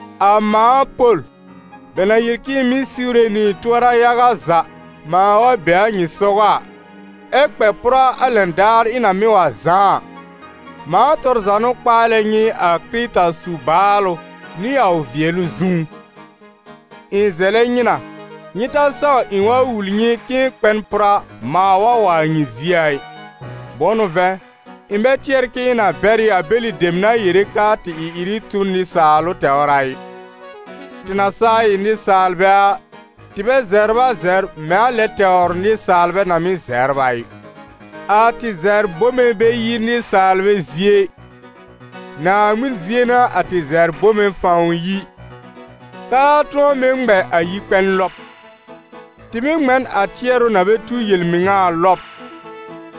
A mãa Pol, bɛ na yel k'ɩ̃ɩ mɩ́ siwre nɩ ɩ̃ tʋɔra yaga za mãa wa be a nyɩ sɔgɔ a, ɛ́ kpɛ pʋra a lɛn daar ɩ̃ na mɩ́ wa zãá a, mãa tɔr za n'ʋ kpaalɛ nyɩ a Kɩrɩta su-baalʋ nɩ a ʋ vɩɛlʋ zũú: ɩ̃ zɛlɛ nyɩ na, nyɩ ta saw ɩ̃ wa wul nyɩ k'ɩ̃ɩ kpɛ n pʋra mãa wa wa a nyɩ zie a ɩ. Bʋ̃ʋ n'ʋ vɛ̃, ɩ̃ bɛ tɩɛr k'ɩ̃ɩ na bɛr ɩ a bɛlɩ dem na yere k'aa tɩ ɩ-ɩrɩ tu n nɩsaalʋ tɛwr a ɩ. Tɩ na saa ɩ nɩsaalbɛ a, tɩ bɛ zɛbr a zɛbr mɛ̃ a lɛ tɛwr nɩsaalbɛ na mɩ́ zɛbr a ɩ. A tɩ zɛbr bome bɛ yi nɩsaalbɛ zie ɩ, Naaŋmɩn zie n'a a tɩ zɛbr bome fãw yi, k'aa tʋ̃ɔ mɩ́ ŋmɛ a yi-kpɛn lɔb. Tɩ mɩ́ ŋmɛ n a tɩɛrʋ na bɛ tu yel-mɩŋa a lɔb,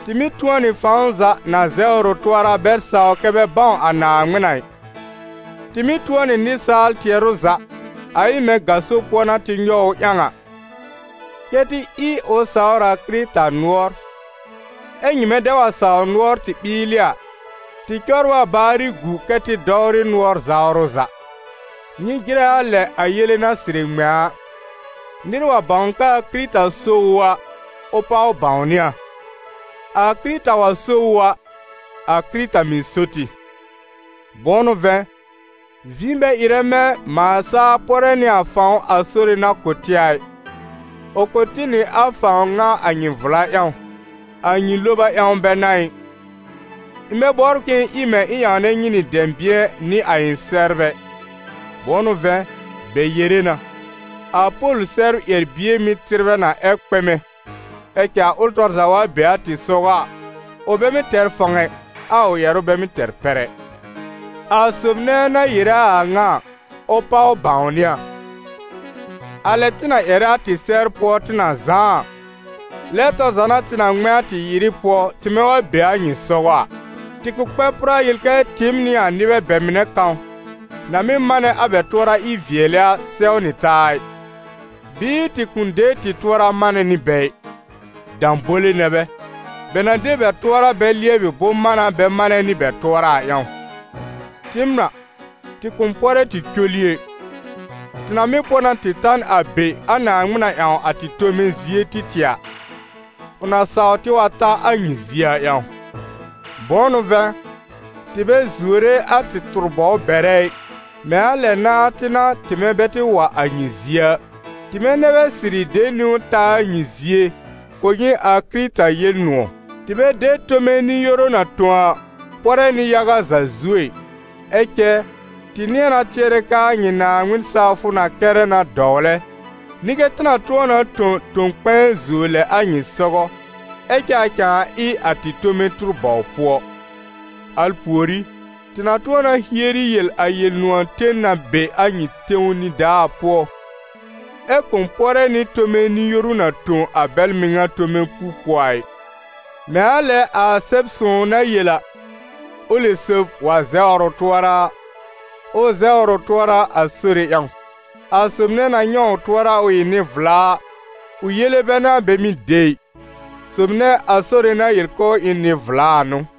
tɩ mɩ́ tʋ̃ɔ nɩ fãw za na zɛwr ʋ tʋɔra bɛ sawr kɛ́ bɛ bãw a Naaŋmɩn a ɩ. Tɩ mɩ́ tʋ̃ɔ nɩ nɩsaal tɩɛrʋ za, a ɩ mɛ̃ gaso pʋɔ n'a tɩ nyɔw ʋ ƴãw a, kɛ́ tɩ ɩ ʋ sawr a Kɩrɩta nʋɔr. Ɛ nyɩmɛ dɛ wa sawr nʋɔr tɩ ɓɩɩlɩ a, tɩ cɔbr a baarɩ gu kɛ́ tɩ dɔwrɩ nʋɔr-zawrʋ za. Nyɩ jɩrɛ a lɛ a yele na sɩrɩ ŋmɛ̃ a: nɩr wa bãw k'aa Kɩrɩta so ʋ a, ʋ páw bãwnɩ a: a Kɩrɩta wa so ʋ a, a Kɩrɩta mɩ̀ so tɩ. Bʋ̃ʋ n'ʋ vɛ̃, vĩ bɛ ɩrɛ mɛ̃ mãa saa pɔrɛ nɩ a fãw a Sore na kʋ̀ tɩ a ɩ, ʋ kʋ̀ tɩ nɩ a fãw ŋa a nyɩ vla ƴãw, a nyɩ loba ƴãw bɛ n'a ɩ. Ɩ̃ bɛ bɔbr k'ɩ̃ɩ ɩ mɛ̃ ɩ̃ ƴãwnɛ nyɩ nɩ dɛ̃bɩ̃ɛ nɩ a ɩ̃ sɛbr ɛ. Bʋ̃ʋ n'ʋ vɛ̃, bɛ yere na: «A Pol sɛbr ƴɛr-bie mɩ́ tɩbrɛ na ɛ kpɛmɛ, ɛ cɛ a ʋl tɔr za wa be a tɩ sɔgɔ a, ʋ bɛ mɩ́ tɛr fãw ɛ, a ʋ ƴɛrʋ bɛ mɩ́ tɛr pɛr ɛ.» A sob nɛ na yere a a ŋa a, ʋ páw bãwnɩ a: a lɛ tɩ na ƴɛrɛ a tɩ sɛbr pʋɔ tɩ na zãá a, lɛ tɔr za n'a tɩ na ŋmɛ̃ a tɩ ɩ-ɩrɩ pʋɔ, tɩmɛ wa be a nyɩ sɔgɔ a. Tɩ kʋ̃ kpɛ pʋra yel kɛ tɩɩm nɩ a nɩbɛ bɛ mɩnɛ kãw, na mɩ́ manɛ a bɛ tʋɔra ɩ-vɩɛlɩ a, sɛw nɩ taa a ɩ, bɩɩ tɩ kʋ̃ de tɩ tʋɔra manɛ nɩ bɛ ɩ. Dãbole nɛ bɛ, bɛ na de bɛ tʋɔra bɛ lɩɛbɩ bʋ̃-mána bɛ manɛ nɩ bɛ tʋɔra a ƴãw. Tɩɩm a, tɩ kʋ̃ pɔrɛ tɩ col ɩ ɛ. Tɩ na mɩ́ pɔ na tɩ ta n a be a Naaŋmɩn na ƴãw a tɩ tome zie tɩ tɩɛ a, ʋ na saw tɩ wa ta a nyɩ zie a ƴãw. Bʋ̃ʋ n'ʋ vɛ̃, tɩ bɛ zuore a tɩ tʋr-bɔw bɛrɛ ɩ, mɛ̃ a lɛ nãa tɩ n'a, tɩmɛ bɛ tɩ wa a nyɩ zie a. Tɩmɛ nɛ bɛ sɩrɩ de niwn ta a nyɩ zie kʋ̀ nyɩ a Kɩrɩta Yel-nʋ̃ɔ̀. Tɩ bɛ de tome nɩ-yoru na tõ a, pɔrɛ nɩ yaga za zuo ɛ. Ɛ cɛ, tɩ nɩ̃ɛ na tɩɛrɛ k'aa nyɩ Naaŋmɩn sawfʋ na kɛrɛ na dɔwlɛ, nɩ kɛ tɩ na tʋ̃ɔ na tõ tõ-kpɛ̃ɛ zuo lɛ a nyɩ sɔgɔ, ɛ cɛ a cãa ɩ a tɩ tome tʋr-bɔw pʋɔ. Al pùorí, tɩ na tʋ̃ɔ na hieri yel a Yel-nʋ̃ɔ̀ ten na be a nyɩ tẽw nidaa pʋɔ, ɛ kʋ̃ pɔrɛ nɩ tome nɩ-yoru na tõ a bɛl mɩŋa tome puo pʋɔ a ɩ. Mɛ̃ a lɛ a Sɛb-sõw na yel a: «Ʋlɩ sob wa zɛwr ʋ tʋɔra a, ʋ zɛwr ʋ tʋɔra a Sore ƴãw.» A sob nɛ na nyɛ̃ ʋ tʋɔra ʋ ɩ nɩ-vla a, ʋ yele bɛ n'a bɛ mɩ́ de ɩ, sob nɛ a Sore na yel k'ʋʋ ɩ n nɩ-vla a n'ʋ.